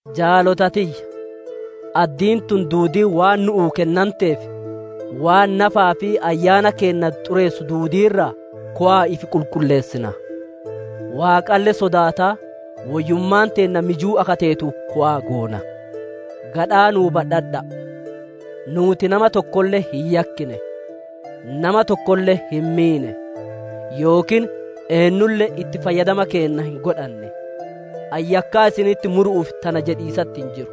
Jaalota tiyya, addiin tun duudiin waan nu'uu kennanteef, waan nafaa fi ayyaana keenna xureessu duudii irraa kowa'a ifi qulqulleessina; Waaqalle sodaataa woyyummaan teenna mijuu akka teetu kowa'a goona. Gadhaa nuu badhadha'a. Nuuti nama tokkolle hin yakkine; nama tokkoolle hin miine; yookiin eennulle itti fayyadama keenna hin godhanne. Ani yakkaa isinitti muru'uuf tana jedhiisatti hin jiru;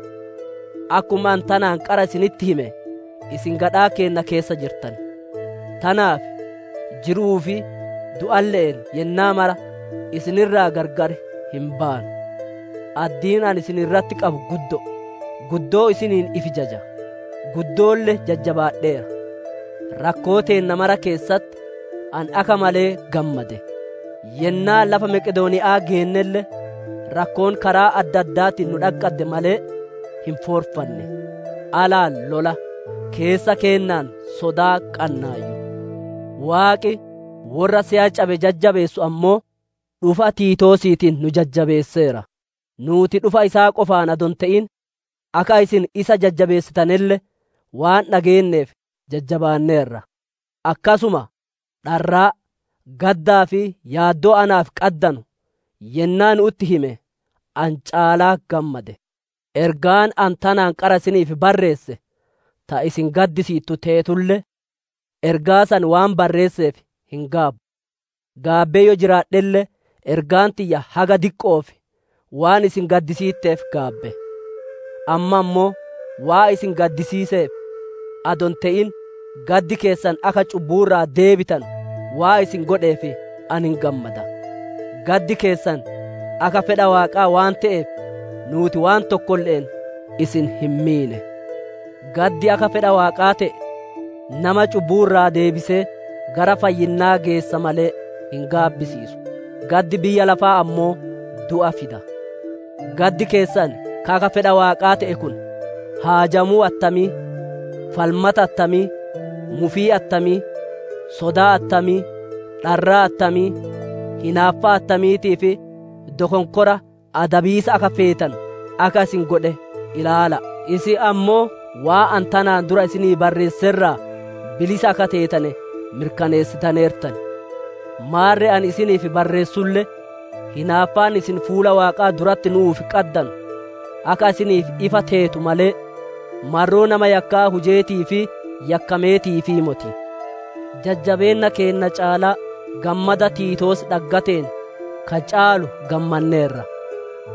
akkuma ani tanaan qara isinitti hime isin gadhaa keenna keessa jirtan. Tanaaf jiru'uu fi du'alle'een yennaa mara isin irraa gargar hin baanu. Addiin ani isin irratti qabu guddo'o; guddoo isiniin ifi jaja; guddoolle jajjabaadheera; rakkoo teenna mara keessatti ani akka malee gammade. Yennaa lafa Maqedooniya'aa geennelle, rakkoon karaa adda addaatiin nu dhaqqadde malee hin foorfanne; alaan lola, keessa keennaan sodaa qannaayyu. Waaqi worra se'a cabe jajjabeessu ammoo, dhufa Tiitoosiitiin nu jajjabeesseera. Nuuti dhufa isaa qofaan adoo hin te'in, akka isin isa jajjabeessitanelle waan dhageenneef jajjabaanneerra. Akkasuma dharraa, gaddaa fi yaaddoo naaf qaddanu yennaa nu'utti hime, ani caalaa gammade. Ergaan ani tanaan qara isiniif barreesse ta isin gaddisiittu teetulle, ergaa san waan barreesseef hin gaabbu; gaabbee yoo jiraadhelle ergaan tiyya haga diqqo'oof waan isin gaddisiitteef gaabbe. Amma ammoo waan isin gaddisiiseef adoo hin te'in, gaddi keessan akka cubbuu irraa deebitanu waan isin godheef ani hin gammada. Gaddi keessan akka fedha Waaqaa waan te'eef, nuuti waan tokkolle'een isin hin miine. Gaddi akka fedha Waaqaa te'e, nama cubbuu irraa deebisee gara fayyinnaa geessa malee, hin gaabbisiisu. Gaddi biyya lafaa ammoo du'a fida. Gaddi keessan ka akka fedha Waaqaa te'e kun haajamuu attamii, falmata attamii, mufii attamii, sodaa attamii, dharraa attamii, hinaaffaa attamiitii fi dokonkora adabiisa akka feetanu akka isin godhe ilaala'a. Isin ammoo waan ani tanaan dura isinii barreesse irraa bilisa akka teetane mirkaneessitaneertan. Maarre ani isiniif barreessulle, hinaaffaan isin fuula Waaqaa duratti nu'uuf qaddanu akka isiniif ifa teetu malee, marroo nama yakkaa hujeetii fi yakkametiifii moti. Jajjabeenna keenna caalaa gammada Tiitoos dhaggateen ka caalu gammanneerra;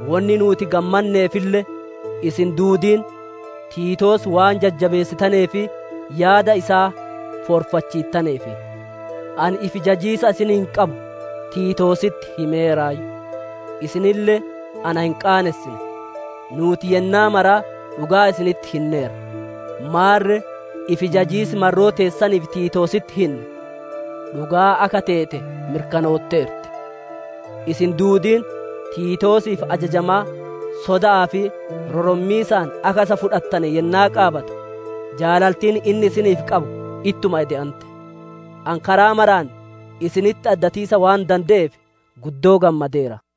wonni nuuti gammanneefille isin duudiin Tiitoos waan jajjabeessitanee fi yaada isaa foorfachiittaneef. Ani ifi jajiisa isiniin qabu Tiitoositti himeeraayyu; isinille na hin qaanessine; nuuti yennaa maraa dhugaa isinitti hinneerra; maarre ifi jajiis marroo teessaniif Tiitoositti hinne, dhugaa akka teete mirkanootteerti. Isin duudiin Tiitoosiif ajajamaa, soda'aa fi rorommiisaan akka isa fudhattane yennaa qaabatu, jaalaltiin inni isiniif qabu ittuma ede'ante. Ani karaa maraan isinitti addatiisa waan dande'eef guddoo gammadeera.